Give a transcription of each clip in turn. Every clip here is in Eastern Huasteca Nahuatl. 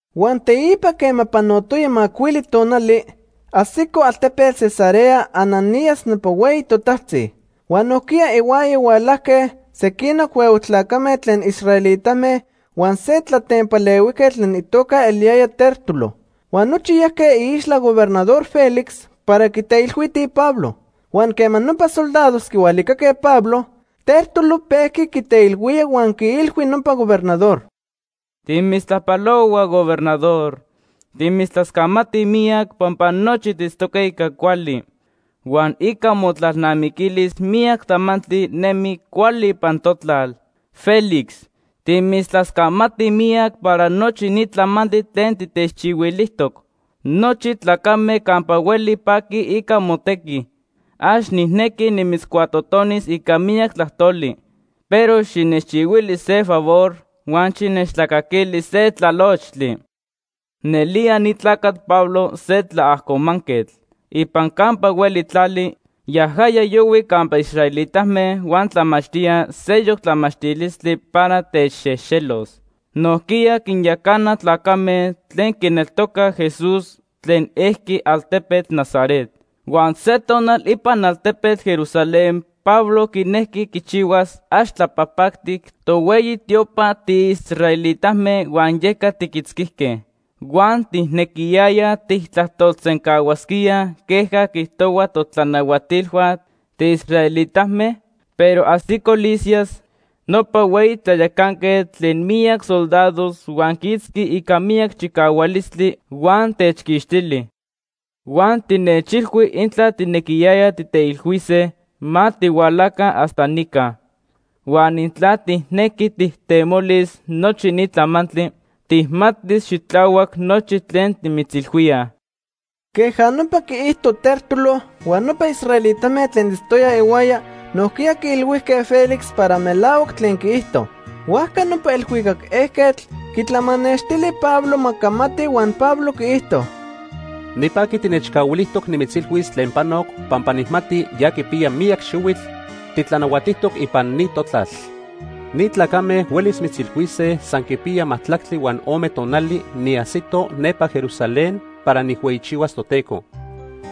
Huan teipa quema panotoya macuili tonali, ajsico altepetl Cesarea Ananías nopa hueyi totajtzi. Huan nojquiya ihuaya hualajque sequinoc huehue tlacame tlen israelitame huan se tlatempalehuijquetl tlen itoca eliyaya Tértulo. Huan nochi yajque iixtla Gobernador Félix para quiteilhuitij Pablo. Huan quema nopa soldados quihualicaque Pablo, Tértulo pejqui quiteilhuía huan quiilhui nopa gobernador: ―Timitztlajpalohuaj, Gobernador. Timitztlascamatij miyac pampa nochi tiitztoque ica cuali, huan ica motlalnamiquilis miyac tlamantli nemi cuali ipan totlal. Félix, timitztlascamatij miyac para nochi ni tlamantli tlen titechchihuilijtoc. Nochi tlacame campa hueli paquij ica motequi. Ax nijnequi nimitzcuatotonis ica miyac tlajtoli, pero xinechchihuili se favor huan xinechtlacaquili se tlalochtli. “Nelía ni tlacatl Pablo se tlaajcomanquetl. Ipan campa hueli tlali, yajaya yohui campa israelitame huan tlamachtía seyoc tlamachtilistli para techxejxelos. Nojquiya quinyacana tlacame tlen quineltocaj Jesús tlen ejqui altepetl Nazaret. Huan se tonal ipan altepetl Jerusalén Pablo quinejqui quichihuas ax tlapajpactic tohueyi tiopa tiisraelitame huan yeca tiquitzquijque. Huan tijnequiyayaj tijtlajtolsencahuasquía queja quiijtohuaj totlanahuatilhua tiisraelitame, pero ajsico Lisias, nopa hueyi tlayacanquetl tlen miyac soldados huan quiitzqui ica miyac chicahualistli huan techquixtili. Huan tinechilhui intla tijnequiyayaj tijteilhuise, ma tihualaca hasta nica. Huan intla tijnequi tijtemolis nochi ni tlamantli, tijmatis xitlahuac nochi tlen timitzilhuíaj.” Queja nopa quiijto Tértulo, huan nopa israelitame tlen itztoyaj ihuaya nojquiya quiilhuijque Félix para melahuac tlen quiijto. Huajca nopa elhuicac ejquetl quitlamanextili Pablo ma camati huan Pablo quiijto: ―Nipaqui tinechcahuilijtoc nimitzilhuis tlen panoc pampa nijmati ya quipiya miyac xihuitl titlanahuatijtoc ipan ni totlal. Ni tlacame huelis mitzilhuise san quipiya majtlactli huan ome tonali niajsito nepa Jerusalén para nijhueyichihuas Toteco.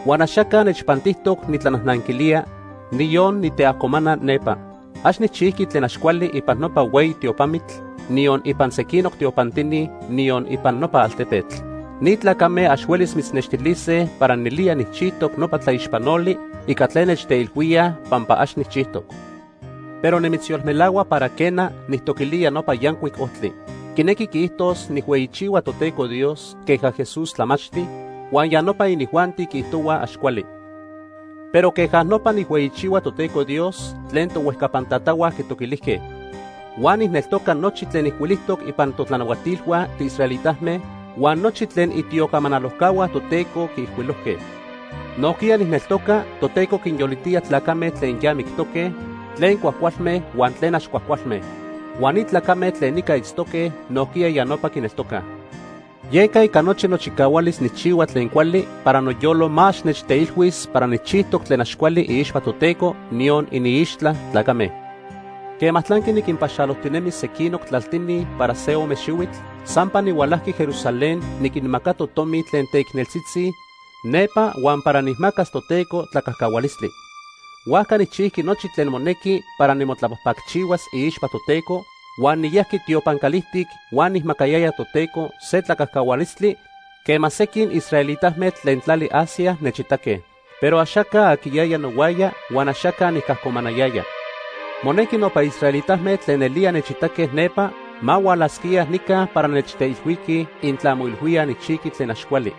Huan axaca nechpantijtoc nitlanajnanquilía, niyon niteajcomana nepa. Ax nijchijqui tlen ax cuali ipan nopa hueyi tiopamitl, niyon ipan sequinoc tiopantini, niyon ipan nopa altepetl. Ni tlacame ax huelis mitznextilise para nelía nijchijtoc nopa tlaixpanoli ica tlen nechteilhuíaj pampa ax nijchijtoc. Pero nimitzyolmelahua para quena, nijtoquilía Nopa Yancuic Ojtli. Quinequi quiijtos nijhueyichihua Toteco Dios queja Jesús tlamachti, huan ya nopa inijuanti quiijtohua ax cuali. Pero queja nopa nijhueyichihua Toteco Dios tlen tohuejcapan tatahua quitoquilijque. Huan nijneltoca nochi tlen ijcuilijtoc ipan totlanahuatilhua tiisraelitame huan nochi tlen itiocamanalojcahua Toteco quiijcuilojque. Nojquiya nijneltoca Toteco quinyolitía tlacame tlen ya mictoque, tlen cuajcualme huan tlen ax cuajcualme. Huan ni tlacame tlen nica itztoque nojquiya ya nopa quineltocaj. Yeca ica nochi nochicahualis nijchihua tlen cuali para noyolo ma ax nechteilhuis para nijchijtoc tlen ax cuali iixpa Toteco, niyon iniixtla tlacame. “Quema tlanqui niquinpaxalojtinemi sequinoc tlaltini para se ome xihuitl, sampa nihualajqui Jerusalén niquinmacato tomi tlen teicneltzitzi nepa huan para nijmacas Toteco tlacajcahualistli. Huajca nijchijqui nochi tlen monequi para nimotlapajpacchihuas iixpa Toteco, huan niyajqui tiopan calijtic huan nijmacayaya Toteco se tlacajcahualistli quema sequin israelitame tlen tlali Asia nechitaque. Pero axaca aquiyaya nohuaya huan axaca nicajcomanayaya. Monequi nopa israelitame tlen nelía nechitaque nepa ma hualasquía nica para nechteilhuiqui intla moilhuíaj nijchijqui tlen ax cuali.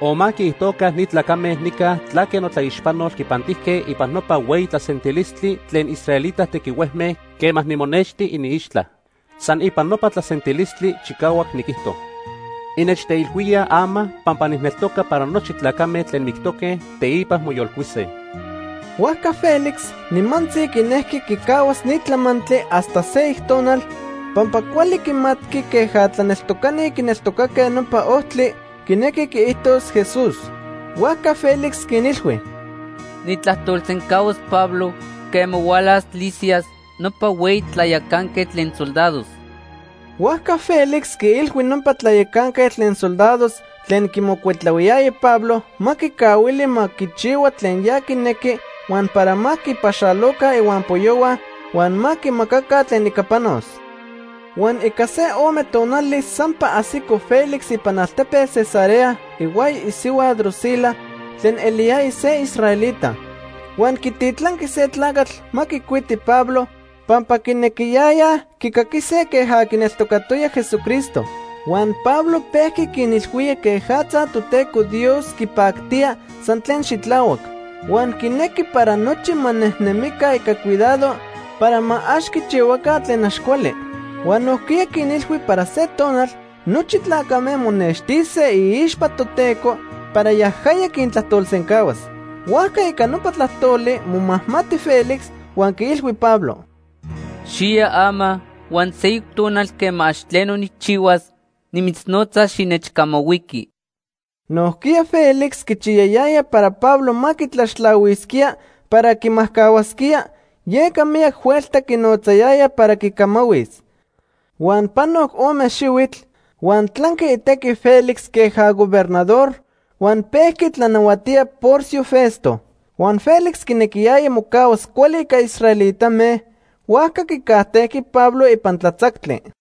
O ma quiijtoca ni tlacame nica tlaque notlaixpanol quipantijque ipan nopa hueyi tlasentilistli tlen israelita tequihuejme quema nimonexti iniixtla. San ipan nopa tlasentilistli chicahuac niquijto: ‘Innechteilhuíaj ama pampa nijneltoca para nochi tlacame tlen mictoque, teipa moyolcuise.’” Huajca Félix nimantzi quinejqui quicahuas ni tlamantli hasta seyoc tonal pampa cuali quimatqui queja tlaneltocani quineltocaque Nopa Ojtli quinequi quiijtos Jesús. Huajca Félix quinilhui: ―Nijtlajtolsencahuas Pablo quema hualas Lisias nopa hueyi tlayacanquetl tlen soldados. Huajca Félix quiilhui nopa tlayacanquetl tlen soldados tlen quimocuitlahuiyaya Pablo ma quicahuili ma quichihua tlen ya quinequi huan para ma quipaxaloca ihuampoyohua huan ma quimacaca tlen ica panos. Huan ica se ome tonali sampa ajsico Félix ipan altepetl Cesarea ihuaya isihua Drusila tlen eliyaya se israelita. Huan quititlanqui se tlacatl ma quicuiti Pablo pampa quinequiyayaj quicaquise queja quineltocatoya Jesucristo. Huan Pablo pejqui quinilhuía quejatza Toteco Dios quipactía san tlen xitlahuac. Huan quinequi para nochi ma nejnemica ica cuidado para ma ax quichihuaca tlen ax cuali. Huan nojquiya quinilhui para se tonal nochi tlacame monextise iixpa Toteco para yajaya quintlajtolsencahuas. Huajca ica nopa tlajtoli momajmati Félix huan quiilhui Pablo: ―Xiya ama, huan seyoc tonal quema ax tleno nijchihuas, nimitznotzas xinechcamahuiqui. Nojquiya Félix quichiyayaya para Pablo ma quitlaxtlahuisquía para quimajcahuasquía, yeca miyac huelta quinotzayaya para quicamahuis. Huan panoc ome xihuitl, huan tlanqui itequi Félix queja gobernador huan pejqui tlanahuatía Porcio Festo. Huan Félix quinequiyaya mocahuas cuali ica israelitame, huajca quicajtejqui Pablo ipan tlatzactli.